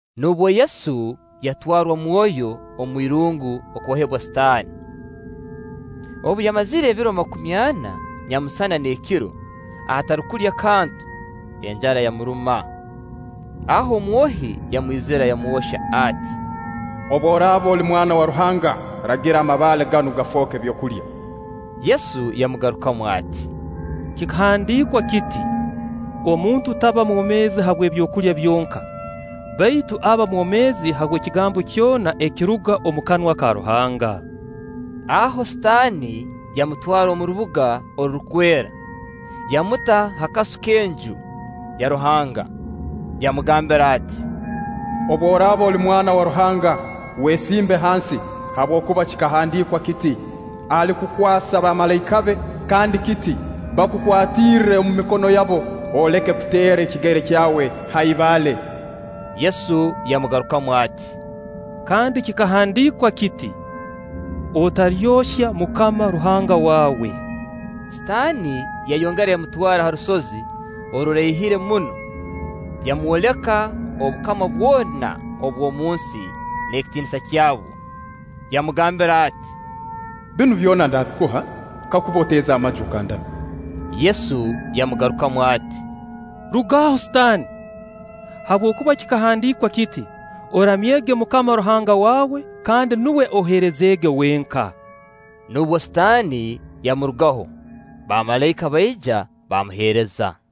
Nubwo Yesu yatwarwa Mwoyo omu irungu okwohebwa Sitaani. Obu yamazire ebiro makumi ana nyamusana n'ekiro atarukulya kantu, enjara yamuruma. Aho omwohi yamwizira yamwohya ati: “Obu oraaba oli Mwana wa Ruhanga, ragira amabaale ganu gafooke byokulya.” Yesu yamugarukamu ati: “Kikahandiikwa kiti: ‘Omuntu taba mwomeezi habw'ebyokulya byonka, baitu aba mwomeezi habw'ekigambo kyona ekiruga omu kanwa ka Ruhanga.’” Aho Sitaani yamutwara omu rubuga orurukwera, yamuta ha kasu k'Enju ya Ruhanga, yamugambira ati: “Obu oraaba oli Mwana wa Ruhanga, wesimbe hansi; habwokuba kikahandiikwa kiti: ‘Alikukwasa bamalaika be’, kandi kiti: ‘Bakukwatirre omu mikono yabo, oleke kuteera ekigere kyawe ha ibaale’.” Yesu yamugarukamu ati: “Kandi kikahandiikwa kiti: ‘Otalyohya MUKAMA Ruhanga waawe’.” Sitaani yayongera yamutwara ha rusozi oruraihire muno, yamwoleka obukama bwona obw'omu nsi n'ekitiinisa kyabwo. Yamugambira ati: “Binu byona ndaabikuha kakuba oteeza amaju okandamya.” Yesu yamugarukamu ati: “Rugaho Sitaani! Habwokuba kikahandiikwa kiti: ‘Oramyege MUKAMA Ruhanga waawe, kandi nuwe oheerezeege wenka’.” Nubwo Sitaani yamurugaho, bamalaika baija baamuheereza.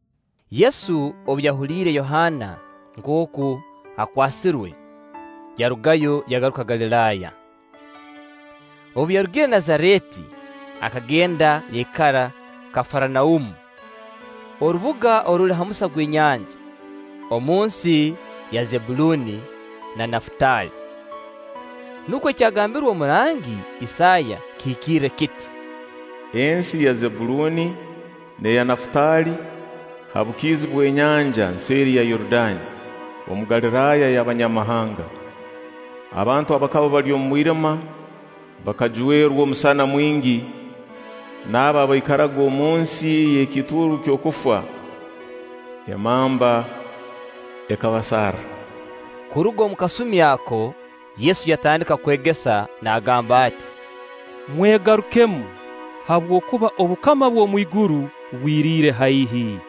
Yesu obu yahuliire Yohaana nkooku akwasirwe, yarugayo yagaruka Galiraaya. Obu yarugire Nazareeti, akagenda yaikara Kafaranaumu, orubuga oruli ha musa gw'enyanja, omu nsi ya Zebbuluuni na Nafutaali. Nukwo ekyagambirwe omurangi Isaaya kihikirre kiti: “Ensi ya Zebbuluuni n'eya Nafutaali, ha bukiizi bw'enyanja, nseeri ya Yorudaani, omu Galiraaya y'Abanyamahanga, abantu abakaba bali omu mwirima, bakajwerwa omusana mwingi, nabo abaikaraga omunsi y'ekiituuru ky'okufa emamba ekabasarra.” Kuruga omu kasumi ako, Yesu yatandika kwegesa naagamba ati: “Mwegarukemu, habwokuba obukama bw'omu iguru bwiriire haihi.”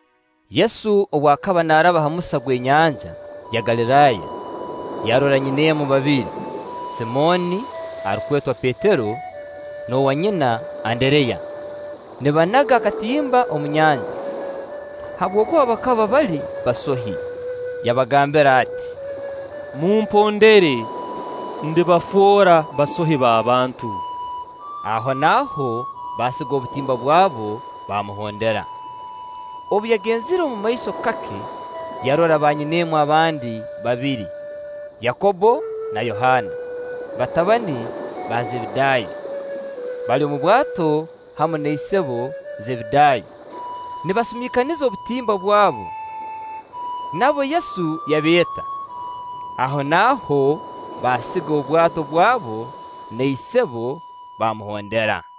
Yesu obu akaba naaraba ha musa gw'enyanja ya Galiraaya, yarora nyineemu babiri, Simooni arukwetwa Petero n'owanyina Andereya, nibanaga akatimba omu nyanja; habwokuba bakaba bali basohi. Yabagambira ati: “Mumpondere, ndibafoora basohi b'abantu.” Ahonaaho baasiga obutimba bwabo baamuhondera. Obu yagenzireho omumaiso kake, yarora banyineemu abandi babiri, Yakobbo na Yohaana, batabani ba Zebedaayo, bali omu bwato hamu na isebo Zebedaayo nibasumiikaniza obutimba bwabo. Nabo Yesu yabeeta. Ahonaaho baasiga obwato bwabo na isebo, baamuhondera.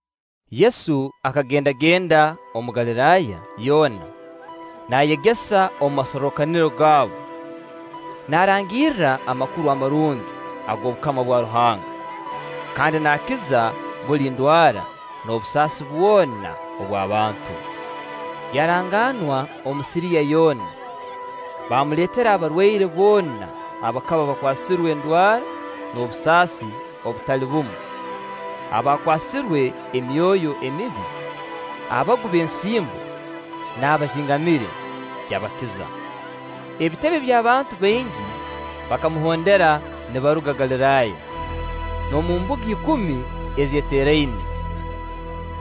Yesu akagendagenda omu Galiraaya yoona, naayegesa omu masorrokaniro gaabo, naarangirra Amakuru Amarungi ag'obukama bwa Ruhanga, kandi naakiza buli ndwara n'obusaasi bwona obw'abantu. Yaranganwa omu Siriya yoona, baamuleetera abarwaire boona abakaba bakwasirwe endwara n'obusaasi obutali bumu, abakwasirwe emyoyo emibi, abagu b'ensimbo, n'abazingamire; yabakiza. Ebitebe by'abantu baingi bakamuhondera nibaruga Galiraaya, n'omu Mbuga Ikumi ezeeteraine,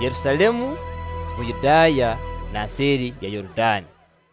Yerusaalemu, Buyudaaya, na nseeri ya Yorudaani.